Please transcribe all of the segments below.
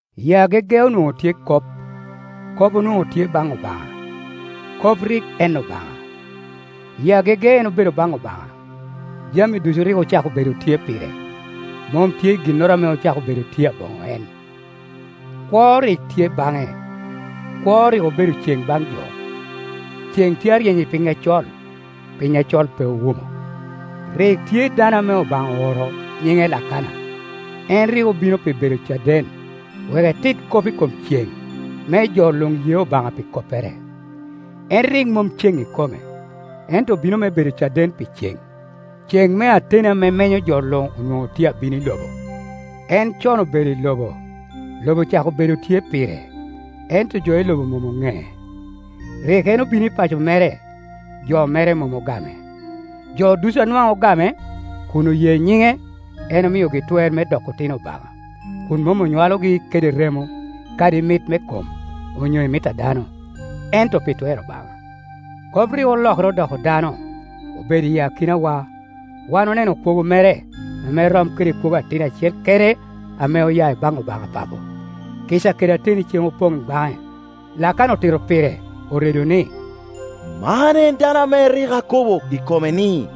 I agege onwoŋo tye Kop. Kop onwoŋo tye baŋ Obaŋa. Kop rik en Obaŋa. I agege en obedo baŋ Obaŋa. Jami ducu rik ocako bedo tye pire; mom tye ginnoro ame ocako bedo tye aboŋo eno Kwo rik tye baŋe, kwo rik obedo ceŋ baŋ jo. Ceŋ tye aryeny i piny acol, piny acol pe owumo. Rik tye dano ame Obaŋa ooro, nyiŋe Lakana. En rik obino pi bedo caden, wek etit kop i kom ceŋ, me jo luŋ ye Obaŋa pi koppere. En rik mom ceŋ ikome, ento obino me bedo caden pi ceŋ. Ceŋ me ateni ame menyo jo luŋ onwoŋo tye abino i lobo. En con obedo i lobo, lobo ocako bedo tye pire, ento jo i lobo mom oŋee. Rik en obino i pa co mere, jo mere mom ogame. Jo ducu a nwaŋ ogame, kun oye nyiŋe, en omiogi twer me doko otino Obaŋa, kun mom onywalogi kede remo, kadi i mit me kom, onyo i mit a dano, ento pi twer Obaŋa. Kop rik olokere odoko dano, obedo i akinawa. Wan oneno kwogo mere, ame rom kede kwogo atin acel kene ame oya i baŋ Obaŋa Papo; kica kede ateni ceŋ opoŋ baŋe. Lakana otito pire, oredo ni, “Man en dano ame rik akobo kop i kome ni,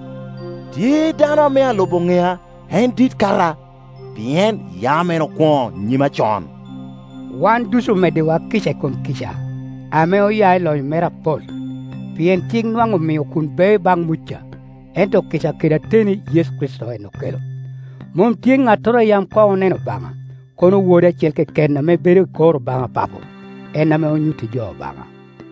‘Tye dano ame alubo ŋea, en dit kata, pien yam en okwoŋo nyima con.’” Wan ducu omeddiwa kica i kom kica, ame oya i lonyo mere apol. Pien cik nwaŋ omio kun bea baŋ Muca, ento kica kede ateni Yecu Kricito en okelo. Mom tye ŋattoro a yam koŋ oneno Obaŋa, kono Wod acel keken ame bedo i kor Obaŋa Papo, en ame onyutti jo Obaŋa.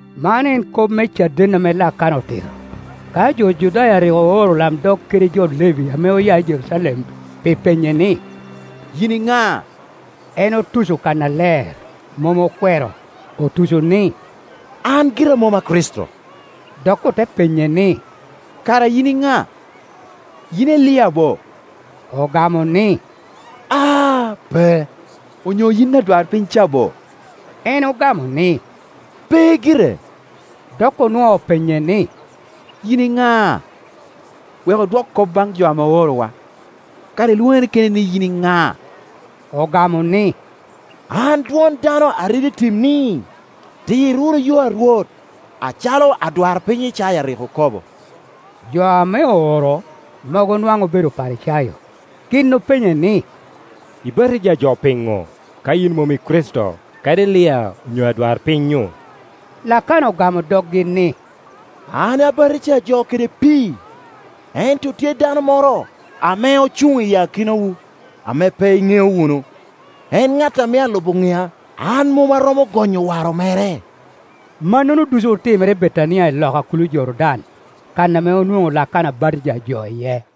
Man en kop me caden ame Lakana otito, ka jo Judaya rik ooro olamdog kede jo Levi ame oya i Jerucalem pi penye ni, “Yin i ŋa?” En otuco kannaler, mom okwero, otuco ni, “An gira mom a Kricito.” Dok ote penye ni, “Kara yin i ŋa? Yin Elia bo?” Ogamo ni, “Aa, pe.” “Onyo yin adwarpiny ca bo?” En ogamo ni, “Pe gire.” Dok onwoo penye ni, “Yin i ŋa? Wek odwok kop baŋ jo ame oorowa. Kara ilwoŋere keni ni yin i ŋa?” Ogamo ni, “An dwon dano a redo i tim ni, ‘Tir wunu yo a Rwot,’ acalo adwarpiny Icaya rik okobo.” Jo ame ooro, mogo nwaŋ obedo Oparicayo. Gin openye ni, “Ibatija jo piŋo, ka yin mom i Kricito, kadi Elia onyo adwarpiny-nyu?” Lakana ogamo doggi ni, “An abato jo kede pii, ento tye dano moro ame ocuŋ i akinawu, ame pe iŋeo wunu. En ŋat ame alubo ŋea, an mom aromo gonyo waro mere.” Mannono ducu otimere i Betania loka kulo Jordan, kan ame onwoŋo Lakana batija jo iye.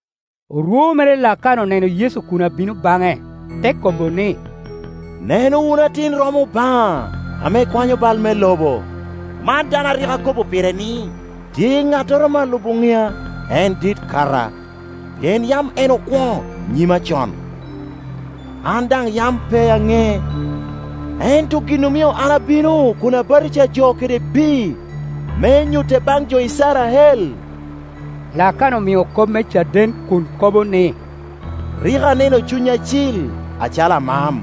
Orwo mere Lakana oneno Yecu kun abino baŋe, te kobo ni, “Neno wunu Atin-romo Obaŋa ame kwanyo bal me lobo. Man dano a rik akobo pire ni, ‘Tye ŋattoro ame alubo ŋea, en dit kata, pien yam en okwoŋo nyima con.’ An daŋ yam pe aŋee; ento gin omio an abino kun abatija jo kede pii, me nyute baŋ jo Icrael.” Lakana omio kop me caden kun kobo ni, “Rik aneno Cuny Acil acalo amam,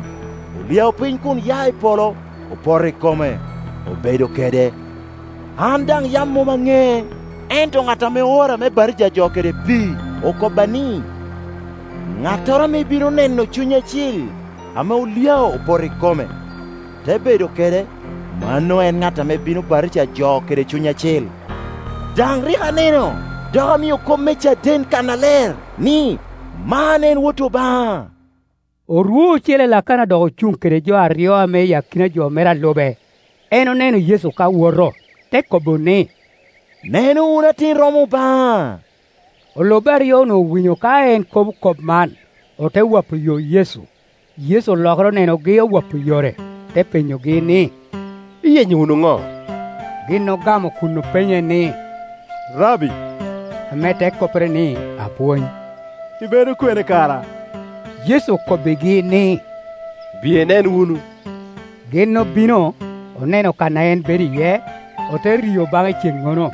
olyao piny kun ya i polo, opoto i kome, obedo kede. An daŋ yam mom aŋee; ento ŋat ame oora me batija jo kede pii okobba ni, ‘Ŋattoro ame ibino neno Cuny Acil ame olyao, opoto i kome, te bedo kede, mano en ŋat ame bino batija jo kede Cuny Acil.’ Daŋ rik aneno dok amio kop me caden kannaler ni, ‘Man en Wot Obaŋa.’” Orwo ocele Lakana dok ocuŋ kede jo aryo ame i akina jo mere a lube. En oneno Yecu ka woto, te kobo ni, “Neno wunu Atin-romo Obaŋa.” Olubbe aryo-nu owinyo ka en kobo kop man, ote wapo yo Yecu. Yecu olokere onenogi owapo yore, te penyogi ni, “Iyenyo wunu ŋo?” Gin ogamo kun openye ni, “Rabbi”, (ame te koppere ni, Apwony) ibedo kwene kara? Yecu okobbigi ni, “Biye inen wunu.” Gin obino, oneno kan a en bedo iye, ote rio baŋe i ceŋnono,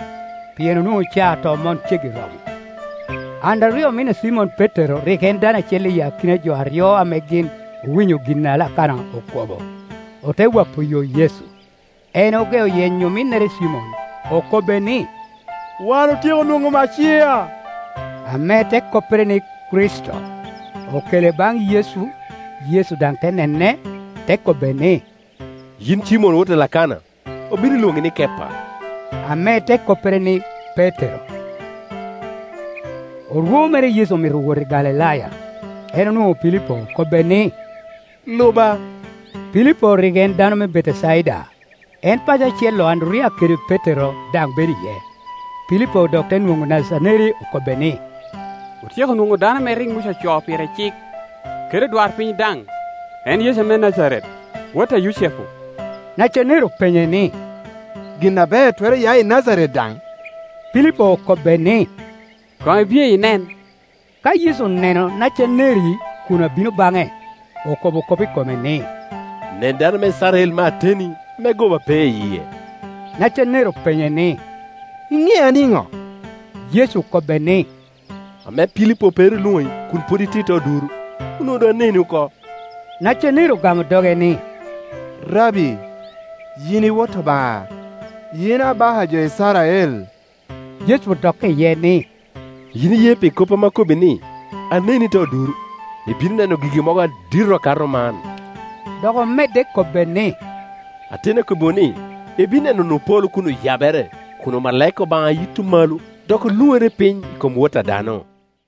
pien onwoŋo caa tomon ceggi romo. Anderiya omin a Cimon Petero rik en dano acel i akina jo aryo ame gin owinyo gin a Lakana okobo, ote wapo yo Yecu. En ogeo yenyo ominnere Cimon, okobbe ni, “Wan otyeko nwoŋo Maciya” (ame te koppere ni, Kricito). Okele baŋ Yecu, Yecu daŋ te nene, te kobbe ni, “Yin i Cimon wot a Lakana; obino lwoŋi ni Kepa” (ame te koppere ni, Petero Petero te koppere: Lela). Orwo mere Yecu omito wot i Galilaya. En onwoŋo Pilipo okobbe ni, “Luba.” Pilipo rik en dano me Betecaida; en paco acel-Iu Anderiya kede Petero daŋ bedo iye. Pilipo dok te nwoŋo Nacaneri, okobbe ni, “Otyeko nwoŋo dano ame rik Muca ocoo pire i cik, kede odwarpiny daŋ, en Yecu me Najaret, wot a Yucepu.” Nacaneri openye ni, “Gin aber twero ya i Najaret daŋ?” Pilipo okobbe ni, “Koŋ ibiye inen.” Ka Yecu oneno Nacaneri kun abino baŋe, okobo kop i kome ni, “Nen dano me Icrael me ateni, ame goba pe i yie.” Nacaneri openye ni, “Iŋea niŋo?” Yecu okobbe ni, “Ame Pilipo pe ru olwoŋi, kun pwod itye i te oduro, onwoŋo doŋ aneni oko.” Nacaneri ogamo doge ni, “Rabbi, yin i Wot Obaŋa! Yin Abaka a jo Icrael!” Yecu odokke iye ni, “Yin iye pi kop ame akobbi ni, ‘Aneni i te oduro?’ Ibino neno gigi mogo adito akato man,” Dok omedde kobbe ni, “Ateni akobbiwu ni ibino neno wunu polo kun oyabere, kun omalaika Obaŋa yito malo dok oluŋere piny i kom Wot a dano.”